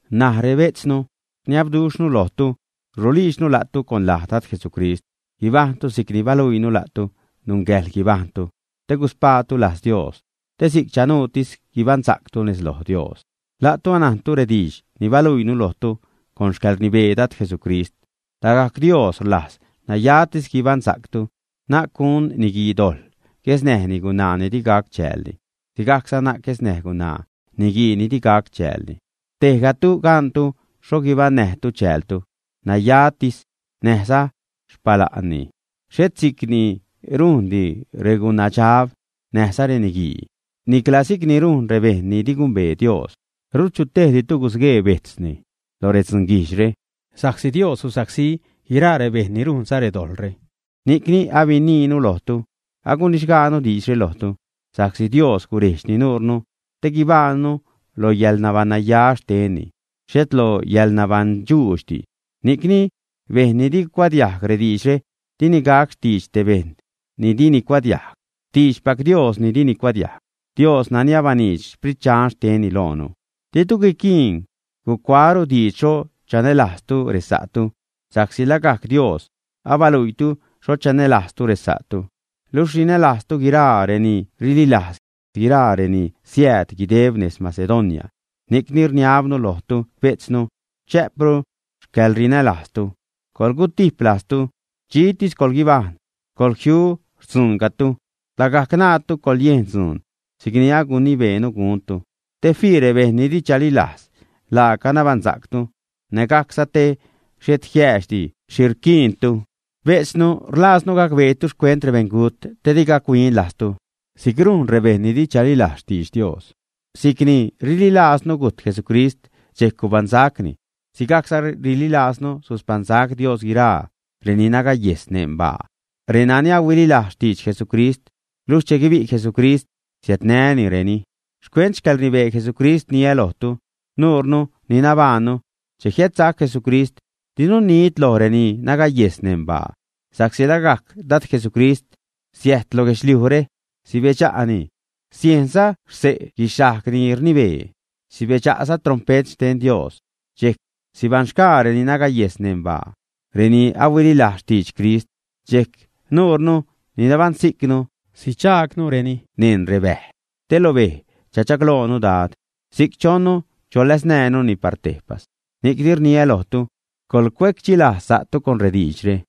N̲aj, rebejtznu, rniabduxhnu lojtu, rulijdxnu la'tu con laj Dad Jesucrist, guibajṉtu si'cni baluiinu la'tu nungäjḻ guibajṉtu te guspaatu lajz Dios, te si'c chanuutis guibaṉsa'ctu nez lo Dios. La'tu, anajntu rediidx ni baluiinu lojtu con xcäḻrnibee Dad Jesucrist. Lagajc Dios rlajz nayatis guibaṉsa'ctu, na'c gun niguii dojḻ guesnäj gunaa ni di gac chäälni, sigajcza na'c guesnäj gunaa niguii ni di gac chäälni. Tejgatu gantu xho guibaṉnäjtu chäältu nayatis näjza xpala'nni. Xhet si'c ni rujndi regunadxab näjza reniguii, nicla si'c ni rujn rebejṉ ni di gumbee Dios. Rut chutejditu gusguee bejtzni lo redzunguijdxre, sa'csi Dios susacsí guiraa rebejṉ ni rujnza redojḻre, ni'cni abiniinu lojtu, agunixgaanu diidxre lojtu. Sa'csi Dios gurejdxni nuurnu te guibajṉnu lo yäḻnabaṉnaya xtenni, xhet lo yäḻnabaṉdxuudxdi. Ni'cni bejṉ ni di gucuadiajg rediidxre, dini gac xtiidx te bejṉ ni dini cuadiajg, xtiidxpac Dios ni dini cuadiajg, Dios nani abaniidx Sprit Dxan xtenni loonu. Ditu guiquiin gucuaäru diidx xho chanälajztu resa'tu, sa'csi lagajc Dios abaluiitu xho chanälajztu resa'tu. Luxh rinälajztu guiraa reni rililajz, guiraa reni siääd guideb nez Macedonia. Ni'cni rniabnu lojtu bejtznu, chä'pru xcäḻrinälajztu. Coḻgutijp lajztu, dxitis coḻguibajṉ, coḻjiu xtzuuncatu, lagajc ṉaatu coḻyejn dzuun si'cni agunibeenu guntu. Te fii rebejṉ ni di chalilajz laaca nabaṉsa'ctu, nägajcza te xhet jiäädxdi xhi rquiintu. Bejtznu, rlajznu gacbeetu xcuent rebeṉgut te di gac-huin lajztu si'c rujn rebejṉ ni di chalilajz xtidx Dios. Si'c ni rililajznu gujt Jesucrist, dxejc gubaṉsacni, sigajcza rililajznu suspaṉsac Dios guiraa reni nagayejs neṉ baa, renani huililajz xtidx Jesucrist. Luxh che guibi' Jesucrist, siädnänireni. Xcuent xcäḻrnibee Jesucrist rniä lojtu, nuurnu ni nabajṉnu che jiädsac Jesucrist, dinu nid loj reni nagayejs neṉ baa. Sa'csi lagajc Dad Jesucrist siäjt lo guedxliujre, sibedxa'ni, siejnza xse' guixhajg ni rnibee, sibedxa'za trompet xten Dios. Dxejc sibaṉxgaa reni nagayejs neṉ baa, reni huililajz xtidx Crist. Dxejc nuure ni nabaṉsijcnu sidxaagnureni neṉ rebäj te lo bej chachagloonu Dad. Si'c chonnu cholaznäjnuni par tejpas. Ni'cni rniä lojtu, coḻcuecdxilajz sa'tu con rediidxre.